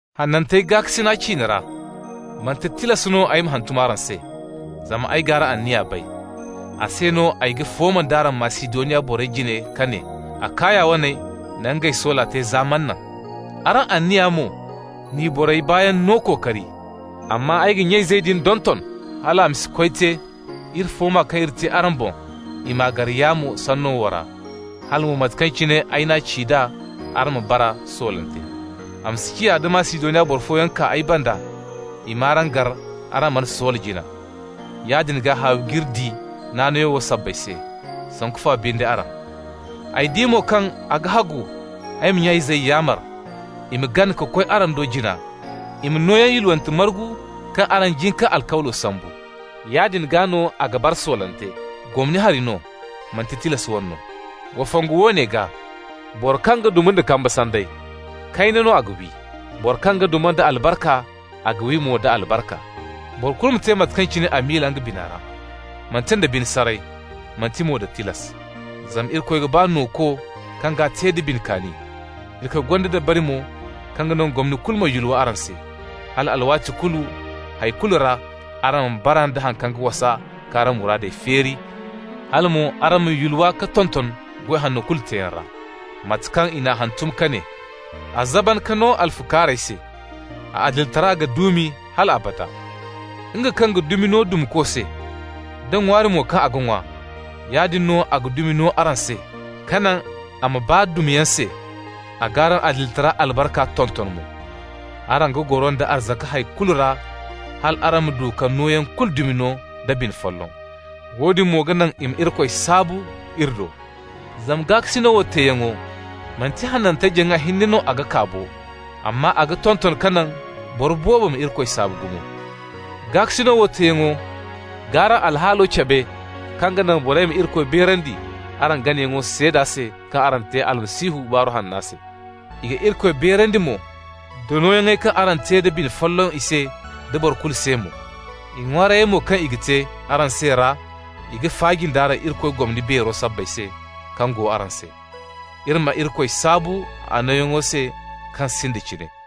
Hanantey gaakasina ciine ra, manti tilas no ay ma hantum araŋ se, zama ay g'araŋ anniya bay. A se no ay ga fooma nd'araŋ Masidoniya borey jine ka ne: Akaya waney na ngey soola te za manaŋ. Araŋ anniya mo n'i borey baayaŋ no kookari. Amma ay ga nya-izey din donton hal a ma si koy te iri fooma kaŋ iri te araŋ boŋ, i m'a gar yaamo sanno wo ra, hala mo mate kaŋ cine ay n'a ci d'a, araŋ ma bara soolante. A ma si ciya, da Masidoniya boro fooyaŋ kaa ay banda, i m'araŋ gar araŋ mana soola jina. Yaadin gaa haawi g'iri di naanayo wo sabbay se, sanku fa binde araŋ! Ay di mo kaŋ a ga hagu ay ma nya-izey yaamar i ma gana ka koy araŋ do jina, i ma nooyaŋ yulwante margu kaŋ araŋ jin k'a alkawlo sambu. Yaadin gaa no a ga bara soolante, gomni hari no, manti tilas wane no. Wa fongu woone gaa: Boro kaŋ ga duma nda kamba sanday, kayna no a ga wi. Boro kaŋ ga duma nda albarka, a ga wi mo da albarka. Boro kulu ma te mate kaŋ cine a miila nga bina ra, manti nda bine saray, manti mo da tilas. Zama Irikoy ga ba nooko kaŋ g'a te da bine kaani. Irikoy gonda dabari mo kaŋ ga naŋ gomni kulu ma yulwa araŋ se, hal alwaati kulu hay kulu ra araŋ ma bara nda haŋ kaŋ ga wasa k'araŋ muraadey feeri, hala mo araŋ ma yulwa ka tonton goy hanno kulu teeyaŋ ra. Mate kaŋ i n'a hantum ka ne: «A zaban ka no alfukaarey se, a adilitara ga duumi hal abada.» Nga kaŋ ga dumi no dumako se, da ŋwaari mo kaŋ a ga ŋwa, yaadin no a ga dumi no araŋ se, ka naŋ a ma baa dumayaŋ se, a g'araŋ adilitara albarka tonton mo. Araŋ ga goro nda arzaka hay kulu ra hal araŋ ma du ka nooyaŋ kulu dumi no da bine folloŋ. Woodin mo ga naŋ i ma Irikoy saabu iri do. Zama gaakasino wo teeyaŋo, manti hanantey jaŋa hinne no a ga kaa bo, amma a ga tonton ka naŋ boro boobo ma Irikoy saabu gumo. Gaakasino wo teeyaŋo g'araŋ alhaalo cabe kaŋ ga naŋ borey ma Irikoy beerandi araŋ ganayaŋo seeda se kaŋ araŋ te Almasihu Baaru Hanna se. I ga Irikoy beerandi mo da nooyaŋey kaŋ araŋ te da bine folloŋ i se da boro kulu se mo. I ŋwaarayey mo kaŋ i ga te araŋ se ra, i ga faaji nd'araŋ Irikoy gomni beero sabbay se kaŋ go araŋ se. Iri ma Irikoy saabu a nooyaŋo se kaŋ sinda cine.